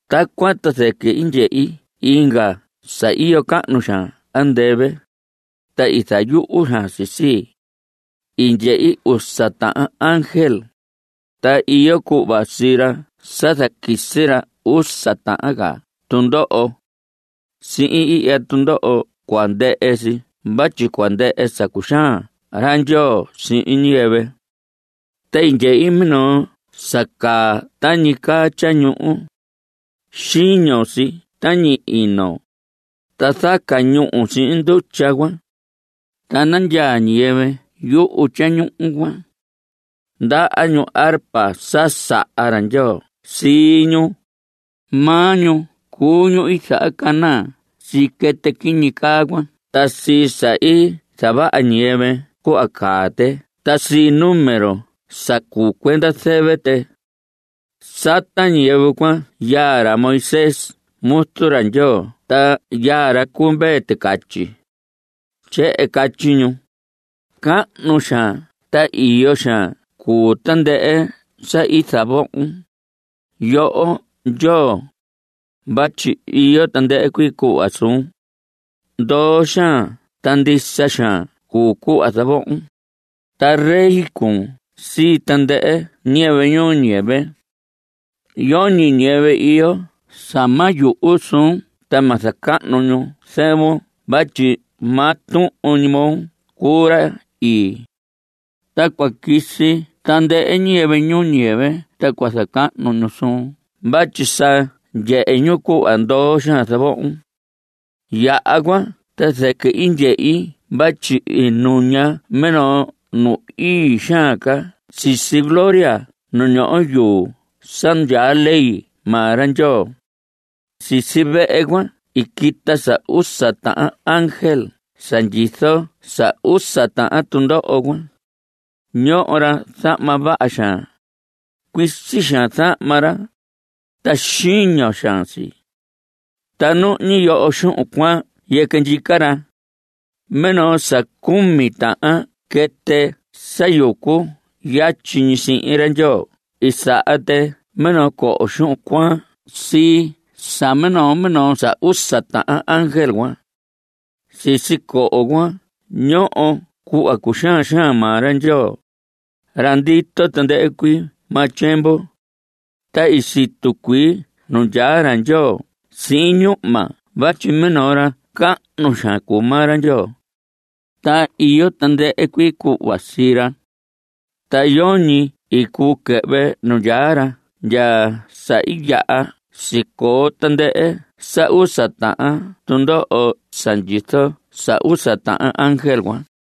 Tacuan ta zɨquɨ i ndyehi inga sa iyo cahnu xaan andɨvɨ, ta i zayuhu xaan si sii. I ndyehi usa tahan ángel, ta iyo cuhva sii ra sa zaquisi ra usa tahan ca tundoho. Sihin ihya tundoho cua ndɨhɨ si vatyi cua ndɨhɨ sa cuxaan ra Ndyoo sihin ñiyɨvɨ. Ta i ndyehi minoo sa caa tañi caa tyañuhu. Xiño si tañi ino, ta zaca ñúhu sihin ndutya cuan. Ta nandyaa ñiyɨvɨ yuhu tyañuhu cuan. Ndaha ñu arpa sa saha ra Ndyoo sii ñu. Maa ñu cuu ñu i zahacanaa sii quɨtɨ quiñi caa cuan ta sii sa i zavaha ñiyɨvɨ cuhva caa tɨ ta sii número sa cuu cuenda zɨvɨ tɨ. Sata ñiyɨvɨ cuan yaa ra Moisés muzu ra Ndyoo ta yaa ra cu Mvee Ticatyi. Tyehen catyi ñu: Cahnu xaan ta iyo xaan cuu tandɨhɨ sa i zavohon, yoho Ndyoo, vatyi iyo tandɨhɨ cuii cuhva suun; Ndoo xaan ta ndisa xaan cuu cuhva zavohon, Ta rey cuun sii tandɨhɨ ñiyɨvɨ ñuu ñiyɨvɨ. Yoñi ñiyɨvɨ iyo sa ma yuhu suun ta ma zacahnu ñu zɨvun Vatyi maa tuhun ñi moo cuu ra ii. Ta cua quisi tandɨhɨ ñiyɨvɨ ñuu ñiyɨvɨ ta cua zacahnu ñu suun Vatyi sa ndyehe ñu cuhva ndoo xaan zavohon. Yaha cuan ta zɨquɨ i ndyehi vatyi i nuña minoo nu ii xaan ca sisi gloria nu ñoho yuu sa ndyaa ley maa ra Ndyoo. Sisi vehe cuan i quita sa usa tahan ángel sa ndyizo sa usa tahan tundoho cuan. Ñoho ra zahma vaha xaan. Cuisi xaan zahma ra, ta xiño xaan si. Ta nuhñi yoho xuhun cuaan yɨquɨ ndyica ra. Minoo sa cumi tahan quɨtɨ sa yucu yatyi ñi sihin ra Ndyoo i saha tɨ minoo coho xuhun cuaan sii sa minoo minoo sa usa tahan ángel cuan. Sisi coho cuan ñoho cuhva cuxaan xaan maa ra Ndyoo, ra ndito tandɨhɨ cuii maa tyiemvu. Ta i situ cuii nu ndyaa ra Ndyoo sihin ñuhma vatyi minoo ra cahnu xaan cuu maa ra Ndyoo, ta iyo tandɨhɨ cuii cuhva sii ra. Ta yoñi i cuu quɨhvɨ nu ndyaa ra ndya sa i yaha sicoo tandɨhɨ sa usa tahan tundoho sa ndyizo sa usa tahan ángel cuan.